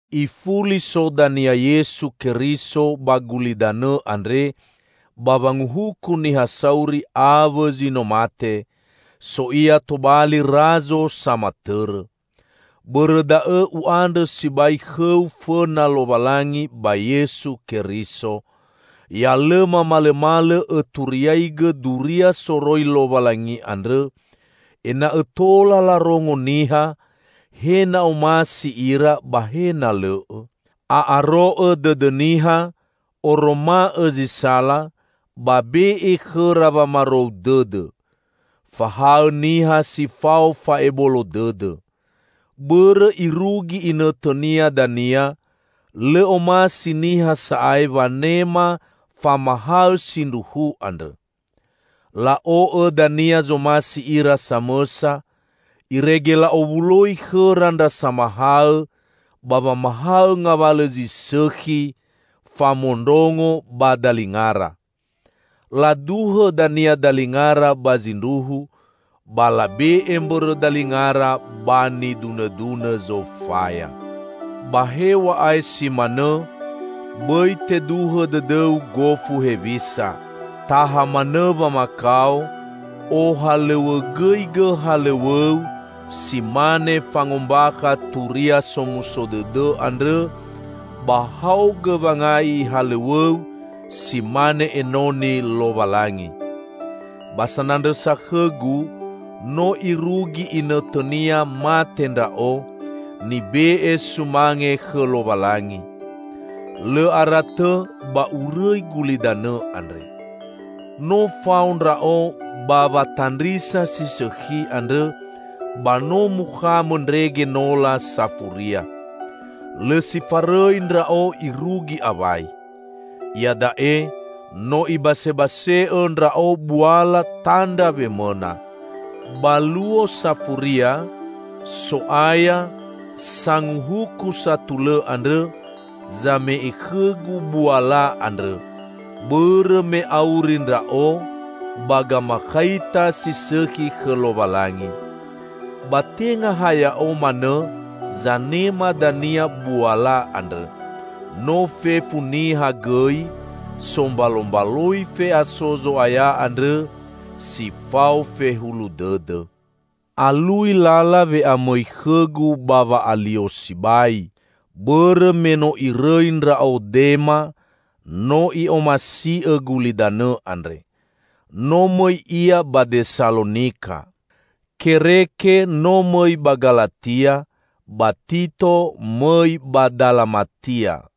Ifuli so dania Yesu Keriso ba gulidanõ andre ba wanguhuku niha sauri awõ zi no mate; so Ia tobali Razo samatõrõ. Bõrõ da'õ u'andrõ sibai khõu fõna Lowalangi ba Yesu Keriso. Ya lõmamalõmalõ õturiaigõ Duria soroi Lowalangi andrõ, ena'õ tola larongo niha, he na omasi ira ba he na lõ'õ. A'aro'õ dõdõ niha, oroma'õ zi sala, ba be'e khõra wamarou dõdõ. Fahaõ niha si fao fa'ebolo dõdõ. Bõrõ irugi inõtõnia dania lõ omasi niha sa'ae wanema famahaõ sindruhu andrõ. La'o'õ dania zomasi ira samõsa, irege la'owuloi khõra ndra samahaõ, ba wamahaõ ngawalõ zi sõkhi famondrongo ba dalingara. Laduhõ dania dalingara ba zindruhu, ba labe'e mbõrõ dalingara ba nidunõdunõ zofaya. Ba hew̃a'ae si manõ, bõi teduhõ dõdõu gofu hewisa. Taha manõ wamakao, ohalõw̃õgõigõ halõw̃õu si mane fangombakha Turia Somuso Dõdõ andrõ, ba haogõ wangai halõw̃õu si mane enoni Lowalangi. Ba sanandrõsa khõgu, no irugi inõtõnia mate ndra'o, nibe'e sumange khõ Lowalangi. Lõ ara tõ ba urõi gulidanõ andre. No fao ndra'o ba watandrisa si sõkhi andrõ, ba no mukhamõ ndrege nola safuria. Lõ si farõi ndra'o irugi awai. Iada'e no ibasebase'õ ndra'o buala tandra wemõna. Ba Luo Safuria, So'aya, Sanguhuku satulõ andrõ, zame'e khõgu buala andrõ, bõrõ me auri ndra'o ba gamakhaita si sõkhi khõ Lowalangi. Ba tenga ha ya'o manõ zanema dania buala andrõ, no fefu niha gõi sombalombaloi fe'aso Zo'aya andrõ si fao fehulu dõdõ. Alui lala we'amõi khõgu ba wa'alio sibai, bõrõ me no irõi ndra'o Dema, no i'omasi'õ gulidanõ andre. No mõi ia ba Desalonika. Kereke no mõi ba Galatia, ba Tito mõi ba Dalamatia.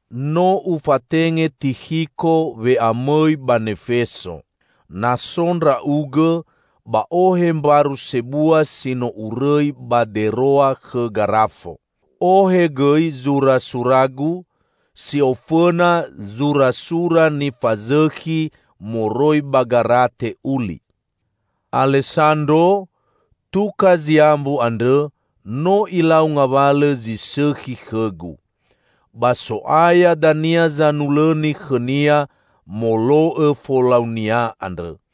No ufatenge Tikhiko we'amõi ba Nefeso. Na so ndra'ugõ, ba ohe mbaru sebua si no urõi ba Deroa khõ Garafo. Ohe gõi zurasuragu, si ofõna zurasura nifazõkhi moroi ba garate uli. Alesandro, tuka ziambu andrõ no ilau ngawalõ zi sõkhi khõgu. Ba So'aya dania zanulõni khõnia molo'õ folaunia andrõ.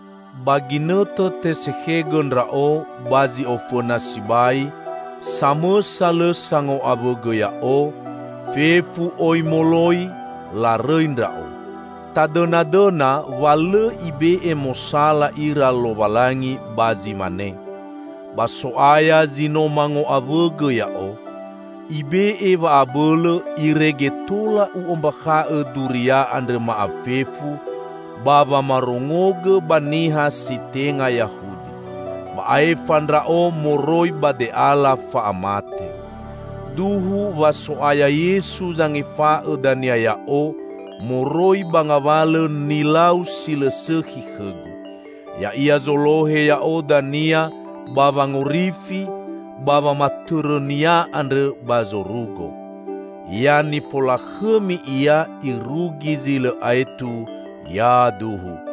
Ba ginõtõ tesekhegõ ndra'o ba zi ofõna sibai, samõsa lõ sango'awõgõ ya'o, fefu oi moloi, larõi ndra'o. Tadõnadõna wa lõ Ibe'e mosala ira Lowalangi ba zi mane! Ba So'aya zi no mango'awõgõ ya'o. Ibe'e wa'abõlõ irege tola u'ombakha'õ Duria andrõ ma'afefu, ba wamarongogõ ba niha si tenga Yahudi. Ba aefa ndra'o moroi ba de'ala fa'amate. Duhu wa So'aya Yesu zangefa'õ dania ya'o moroi ba ngawalõ nilau si lõ sõkhi khõgu. Ya'ia zolohe ya'o dania ba wangorifi ba wamatõrõ-Nia andrõ ba zorugo. Ya nifolakhõmi Ia irugi zi lõ aetu! Yaduhu.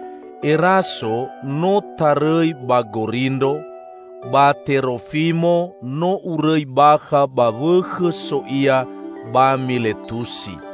Eraso no tarõi ba Gorindro, ba Terofimo, no urõi bakha ba wõkhõ so ia ba Miletusi.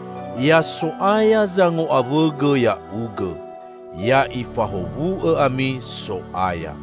Ya So'aya zango'awõgõ ya'ugõ. Ya'Ifahowu'õ ami So'aya!